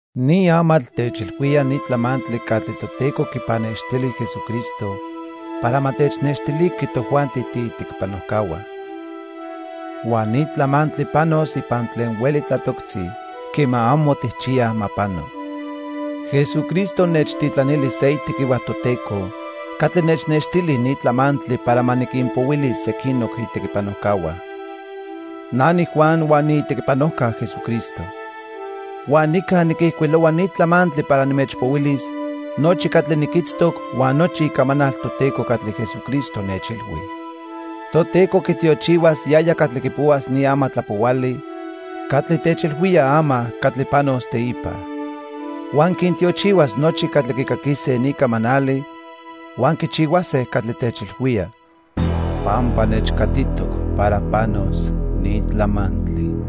Ni amatl techilhuía ni tlamantli catli Toteco quipannextili Jesucristo para ma technextiliqui tojuanti tiitequipanojcahua. Huan ni tlamantli panos ipan tlen hueli tlatoctzi quema amo tijchiyaj ma pano. Jesucristo nechtitlanili se itequihua Toteco catli nechnextili ni tlamantli para ma niquinpohuilis sequinoc itequipanojcahua. Na niJuan huan niitequipanojca Jesucristo. Huan nica niquijcuilohua ni tlamantli para nimechpohuilis nochi catli niquitztoc huan nochi icamanal Toteco catli Jesucristo nechilhui. Toteco quitiochihuas yaya catli quipohuas ni amatlapohuali catli techilhuía ama catli panos teipa. Huan quintiochihuas nochi catli quicaquise ni camanali huan quichihuase catli techilhuía pampa nechcatitoc para panos ni tlamantli.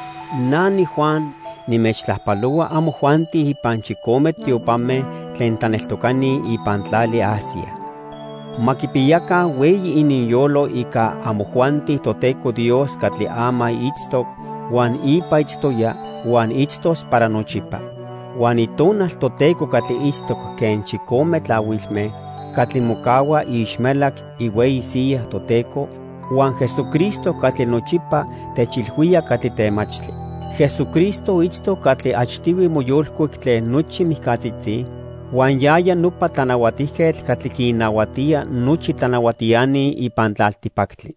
Na niJuan, nimechtlajpalohua amojuanti ipan chicome tiopame tlen tlaneltocani ipan tlali Asia. Ma quipiyaca hueyi ininyolo ica amojuanti Toteco Dios catli ama itztoc, huan ipa itztoya, huan itztos para nochipa; huan Itonal Toteco catli itztoc quen chicome tlahuilme catli mocahua iixmelac ihueyi siya Toteco, huan Jesucristo catli nochipa techilhuía catli temachtli. Jesucristo itztoc catli achtihui moyolcuic tlen nochi mijcatzitzi, huan yaya nopa tlanahuatijquetl catli quinnahuatía nochi tlanahuatiani ipan tlaltipactli.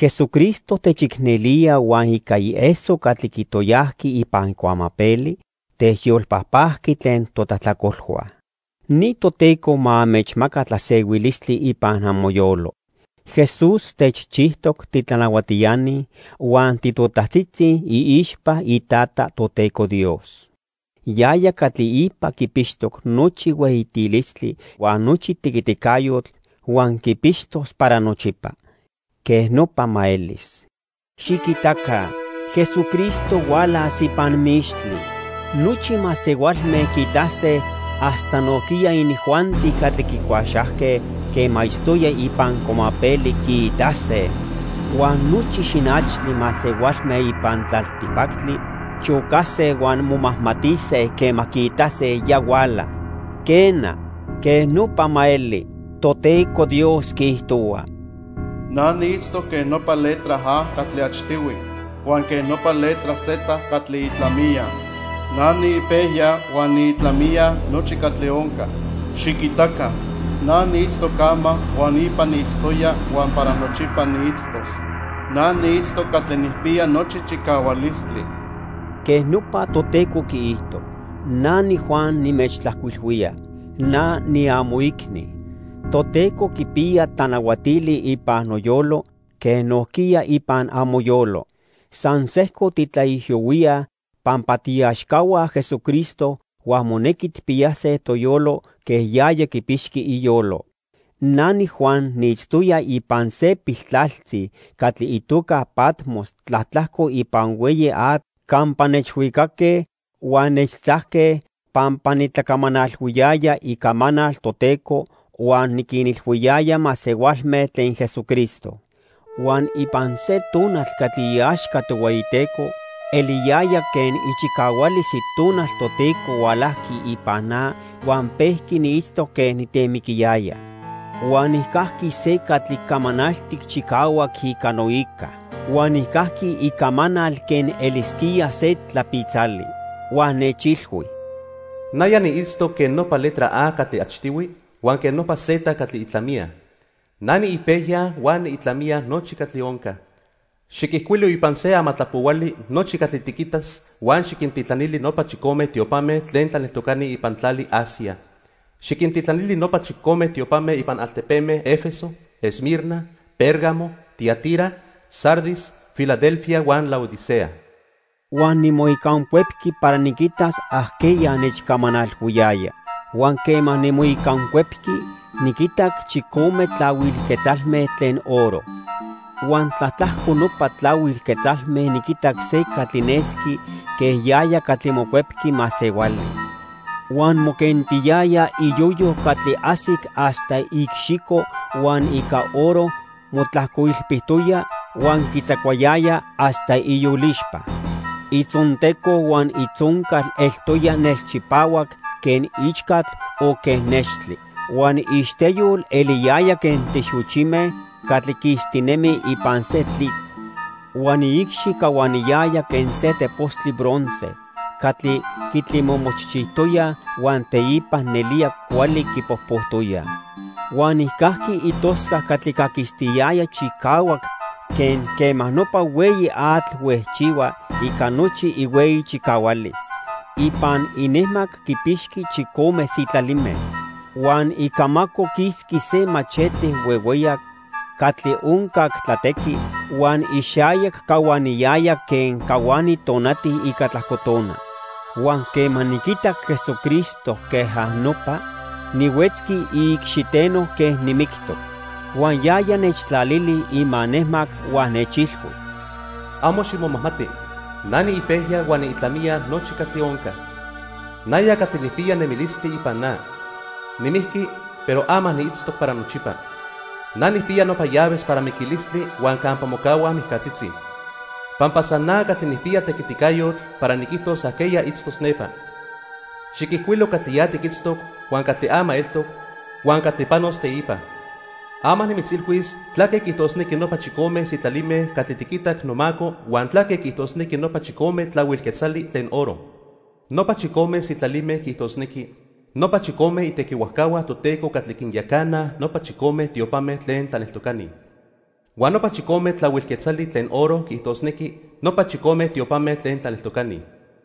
Jesucristo techicnelía huan ica ieso catli quitoyajqui ipan cuamapeli, techyolpajpajqui tlen totlajtlacolhua. Ni Toteco ma anmechmaca tlasehuilistli ipan amoyolo. Jesús techchijtoc titlanahuatiani huan titotajtzitzi iixpa iTata, Toteco Dios. Yaya catli ipa quipixtoc nochi hueyitilistli huan nochi tequiticayotl huan quipixtos para nochipa. Quej nopa elis. Xiquitaca, Jesucristo hualas ipan mixtli. Nochi masehualme quiitase hasta nojquiya inijuanti catli quicuaxajque quema itztoya ipan cuamapeli quiitase. Huan nochi xinachtli masehualme ipan tlaltipactli chocase huan momajmatise quema quiitase ya huala. Quena, quej nopa ma eli. Toteco Dios quiijtohua: "Na niitztoc quen nopa letra A catli achtihui huan quen nopa letra Z catli itlamiya. Na niipejya huan niitlamiya nochi catli onca. Xiquitaca, na niitztoc ama huan ipa niitztoya huan para nochipa niitztos. Na niitztoc Catli Nijpiya Nochi Chicahualistli." Quej nopa Toteco quiijto. Na niJuan nimechtlajcuilhuía. Na niamoicni. Toteco quipiya tlanahuatili ipan noyolo quen nojquiya ipan amoyolo. San sejco titlaijiyohuíaj pampa tiiaxcahua Jesucristo huan monequi tijpiyase toyolo quen yaya quipixqui iyolo. Na niJuan niitztoya ipan se piltlaltzi catli itoca Patmos tlatlajco ipan hueyi atl campa nechhuicaque huan nechtzajque pampa nitlacamanalhuiyaya icamanal Toteco huan niquinilhuiyaya masehualme tlen Jesucristo. Huan ipan se tonal catli iaxca Tohueyiteco, eliyaya quen ichicahualis Itonal Toteco hualajqui ipan na huan pejqui niitztoc quen nitemiquiyaya. Huan nijcajqui se catli camanaltic chicahuac ica noica. Huan nijcajqui icamanal quen elisquía se tlapitzali. Huan nechilhui: "Naya niitztoc quen nopa letra A catli achtihui huan quen nopa Z catli itlamiya. Na niipejya huan niitlamiya nochi catli onca. Xiquijcuilo ipan se amatlapohuali nochi catli tiquitas huan xiquintitlanili nopa chicome tiopame tlen tlaneltocani ipan tlali Asia. Xiquintitlanili nopa chicome tiopame ipan altepeme 'Efeso, Esmirna, Pérgamo, Tiatira, Sardis, Filadelfia huan Laodicea." Huan nimoicancuepqui para niquitas ajqueya nechcamanalhuiyaya. Huan quema nimoicancuepqui, niquitac chicome tlahuil quetzalme tlen oro. Huan tlatlajco nopa tlahuil quetzalme niquitac se catli nesqui quen yaya catli Mocuepqui Masehuali. Huan moquentiyaya iyoyo catli ajsic hasta iicxico huan ica oro motlajcoilpitoya huan quitzacuayaya hasta iyolixpa. Itzonteco huan itzoncal eltoya nelchipahuac quen ichcatl o quen nextli. Huan iixteyol eliyaya quen tlixochime catli quistinemi ipan se tlitl. Huan iicxi cahuaniyaya quen se tepostli bronce catli quitlimomochchijtoyaj huan teipa nelía cuali quipojpojtoyaj. Huan nijcajqui itoscac catli caquistiyaya chicahuac quen quema nopa hueyi atl huejchihua ica nochi ihueyi chicahualis. Ipan inejmac quipixqui chicome sitlalime. Huan icamaco quisqui se machete huehueyac catli oncac tlatequi, huan ixayac cahuaniyaya quen cahuani tonati ica tlajco tona. Huan quema niquitac Jesucristo quej nopa, nihuetzqui iicxiteno quen nimictoc. Huan yaya nechtlalili imanejmac huan nechilhui: "Amo ximomajmati. Na niipejya huan niitlamiya nochi catli onca. Naya catli nijpiya nemilistli ipan na. Nimijqui, pero ama niitztoc para nochipa. Na nijpiya nopa llaves para miquilistli huan campa mocahuaj mijcatzitzi, pampa san na catli nijpiya tequiticayotl para niquijtos ajqueya itztos nepa. Xiquijcuilo catli ya tiquitztoc, huan catli ama eltoc, huan catli panos teipa. Ama nimitzilhuis tlaque quiijtosnequi nopa chicome sitlalime catli tiquitac nomaco huan tlaque quiijtosnequi nopa chicome tlahuil quetzali tlen oro. Nopa chicome sitlalime quiijtosnequi nopa chicome itequihuajcahua Toteco catli quinyacanaj nopa chicome tiopame tlen tlaneltocani. Huan nopa chicome tlahuil quetzali tlen oro quiijtosnequi nopa chicome tiopame tlen tlaneltocani."